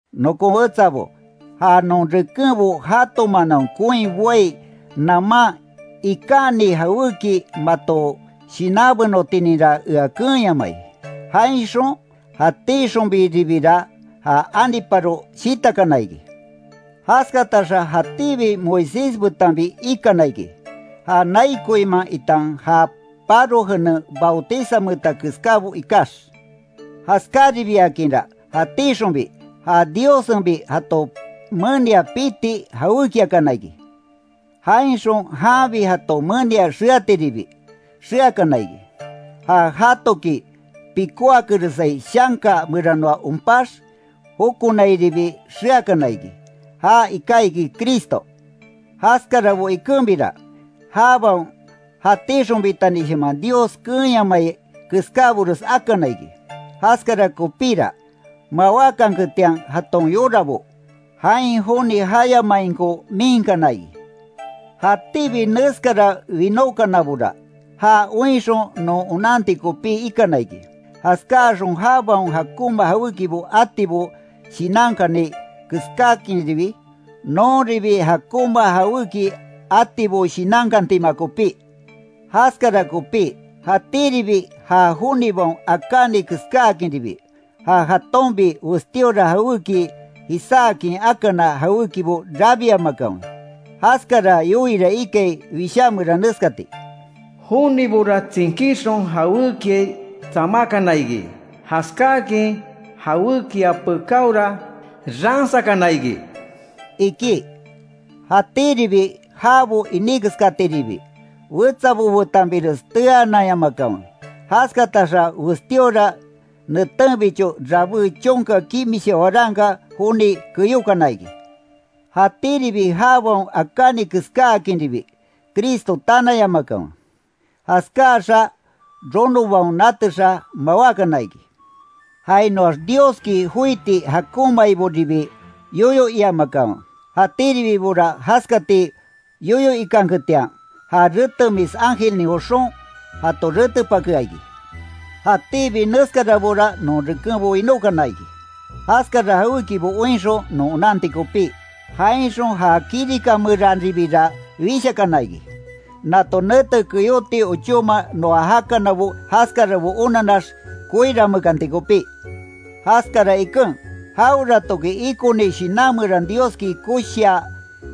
Nokon wetsabo, ja non rekenbo jato manaon koin boai naman ikaní jawéki mato shinanbenotininra ea keenyamai, jainxon jatíxonbiribira ja aniparo shitakana iki. Jaskataxa jatíbi Moisés betanbi ikana iki, ja nai koinman itan ja paro jenen bautizanmeeta keskábo ikax. Jaskáribiakinra jatíxonbi, ja Diossenbi jato menia piti jawékiakana iki. Jainxon janbi jato menia xeatiribi, xeakana iki. Ja jatoki pikóakeresai shanka meranoa onpax jokonairibi xeakana iki, ja iká iki Cristo. Jaskarabo ikenbira, jabaon jatíxonbitanishaman Dios keenyamai keskábores akana iki, jaskara kopíra, mawákanketian jaton yorabo, jain joni jayamainko miinkana iki. Jatíbi neskara winókanabora, ja oinxon non onanti kopí ikana iki. Jaskáaxon jabaon jakonma jawékibo atibo shinankani keskáakinribi, nonribi jakonma jawéki atibo shinankantima kopí. Jaskara kopí, jatíribi ja jonibaon akáni keskáakinribi, ja jatonbi westíora jawéki jisaakin akana jawékibo rabiamakanwe. Jaskara yoiira ikai Wishá meran neskati: “Jonibora tsinkíxon jawékiai tsamákana iki, jaskáakin jawékia pekáora, ransakana iki”, iki. Jatíribi jabo iní keskatiribi, wetsabo betanbires teananyamakanwe, jaskataxa westíora netenbicho rabé chonka kimisha waranka joni keyókana iki. Jatíribi jabaon akáni keskáakinribi, Cristo tanayamakanwe. Jaskáaxa ronobaon natexa, mawákana iki. Jainoax Dioski joíti jakonmaiboribi yoyo iamakanwe, jatíribibora jaskati yoyo ikanketian, ja retemis ángelnin joxon jato retepakea iki. Jatíbi neskarabora non rekenbo winókana iki, jaskara jawékibo oinxon non onanti kopí, jainxon ja kirika meranribira wishakana iki, nato nete keyóti ochóma noa jakanabo jaskarabo onanax koiranmeekanti kopí. Jaskara iken, jaweratoki ikoni shinan meran Dioski koshia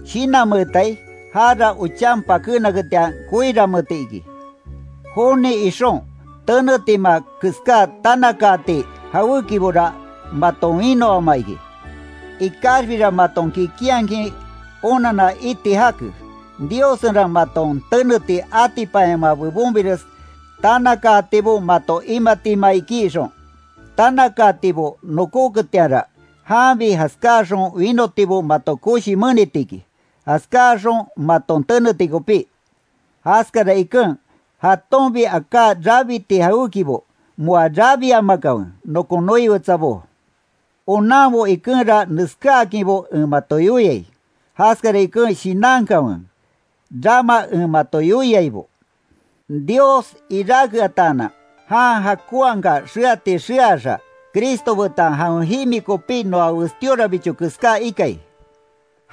shinanmeetai, jara ochan pakénaketian koiranmeeti iki. Joni ixon, tenetima keská tanakaati jawékibora maton winoama iki. Ikaxbira maton kikinhakin onanna iti jake, Diossenra maton teneti atipanyamaa bebonbires tanakaatibo mato imatima iki ixon, tanakaatibo nokoketianra, janbi jaskáaxon winotibo mato koshi meniti iki, jaskáaxon maton teneti kopí. Jaskara iken, jatonbi aká rabiti jawékibo moa rabiamakanwe nokon noi wetsabó. Onanbo ikenra neskáakinbo en mato yoiai, jaskara iken shinankanwe, rama en mato yoiaibo. Dios iráke ataanan, jan jakonhaka xeati xeaxa, Cristo betan jawen jimi kopi noa westíorabicho keská ikai,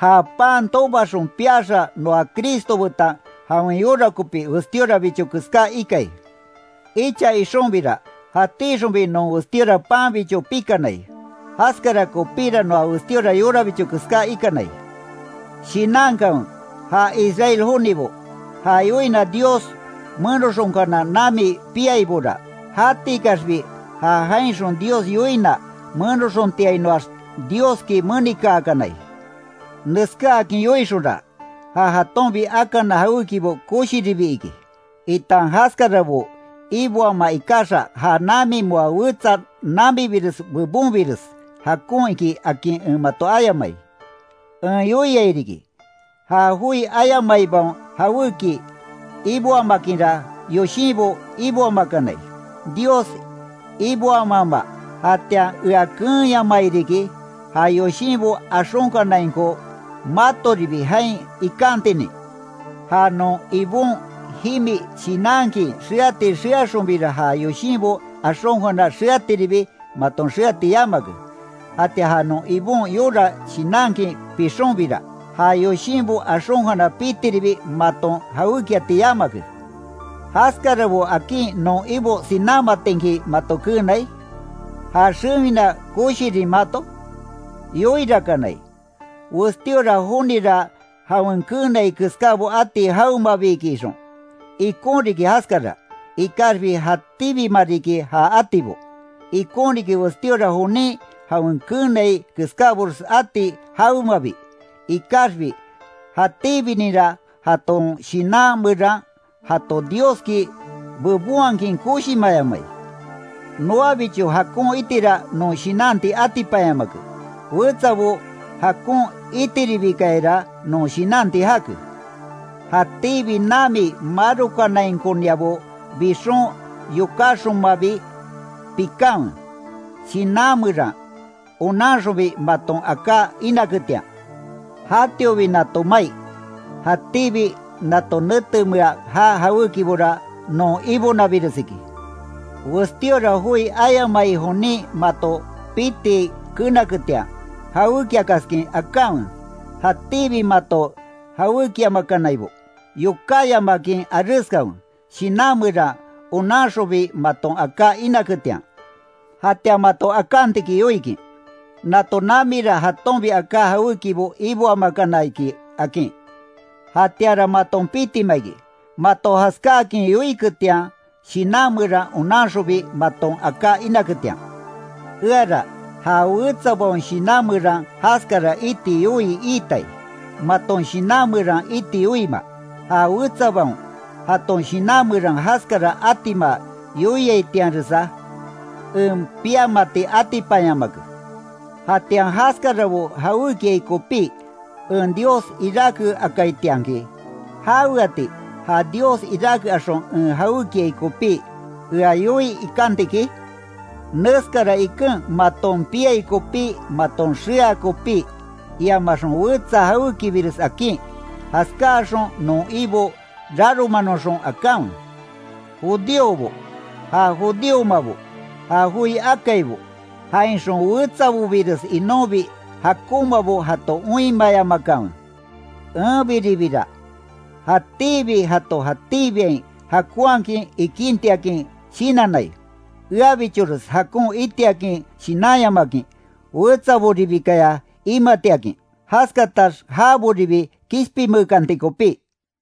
ja pan tobaxon piaxa noa Cristo betan jawen yora kopi westíorabicho keská ikai. Icha ixonbira, jatíxonbi non westíora panbicho pikanai, jaskara kopíra noa westíora yorabicho keská ikanai. Shinankanwe, ja Israel jonibo, ja yoina Dios menoxonkana nami piaibora, jatikaxbi ja jainxon Dios yoina menoxontiainoax Dioski menikaakanai. Neskáakin yoixonra, ja jatonbi akana jawékibo koshiribi iki, itan jaskarabo iboamaa ikaxa ja nami moa wetsa namibires bebonbires jakon iki, akin en mato ayamai. En yoiai riki, ja joi ayamaibaon jawéki iboamakinra yoshinbo iboamakanai, Dios iboamaama, jatian ea keenyamai riki, ja yoshinbo axonkanainko matoribi jain ikantinin. Ja non Ibon jimi shinankin, xeati xeaxonbira ja yoshinbo axonkana xeatiribi maton xeati yamake, jatian ja non Ibon yora shinankin pixonbira, ja yoshinbo axonkana pitiribi maton jawékiati yamake. ¿Jaskarabo akin non Ibo sinámatinki mato keenai? ¿Já xewina koshirin mato? Yoirakanai, westíora jonira jawen keenai keskábo ati jawemabi iki ixon. Ikon riki jaskara, ikaxbi jatíbima riki ja atibo. Ikon riki westíora jonin jawen keenai keskábores ati jawemabi, ikaxbi jatíbininra jaton shinan meran jato Dioski bebonhakin koshimayamai. Noabicho jakon itira non shinanti atipanyamake, wetsabo jakon itiribikayara non shinanti jake. Jatíbi nami marokanainkoniabo bixon yokáxonmabi pikanwe, shinan meran, onanxonbi maton aká inaketian. Jatiobi nato mai, jatíbi nato netemea jaa jawékibora non ibonabires iki. Westíora joi ayamai jonin mato piti kenaketian, jawékiakaskin akanwe, jatíbi mato jawékiamakanaibo, yokáyamakin areskanwe, shinan meran, onanxonbi maton aká inaketian. Jatian mato akantiki yoikin: “Nato namira jatonbi aká jawékibo iboamakana iki”, akin. Jatianra maton pitima iki, mato jaskáakin yoiketian, shinan meran, onanxonbi maton aká inaketian. Eara, ja wetsabaon shinan meran jaskara iti yoii iitai, maton shinan meran iti yoiima, ja wetsabaon, jaton shinan meran jaskara atima yoiaitianresa en piamati atipanyamake. Jatian jaskarabo jawékiai kopí, en Dios iráke akaitianki ¿Jaweati, ja Dios iráke axon en jawékiai kopí, ea yoii ikanti iki? Neskara iken maton piai kopí maton xea kopí, iamaxon wetsa jawékibires akin, jaskáaxon non Ibo raromanoxon akanwe. Judíobo, ja judíomabo, ja joi akaibo, jainxon wetsabobires inonbi jakonmabo jato oinmayamakanwe. Enbiribira jatíbi jato jatíbiain jakonhakin ikíntiakin shinannai, eabichores jakon itiakin shinanyamakin wetsaboribikaya imatiakin, jaskatax jaboribi kishpinmeekanti kopí.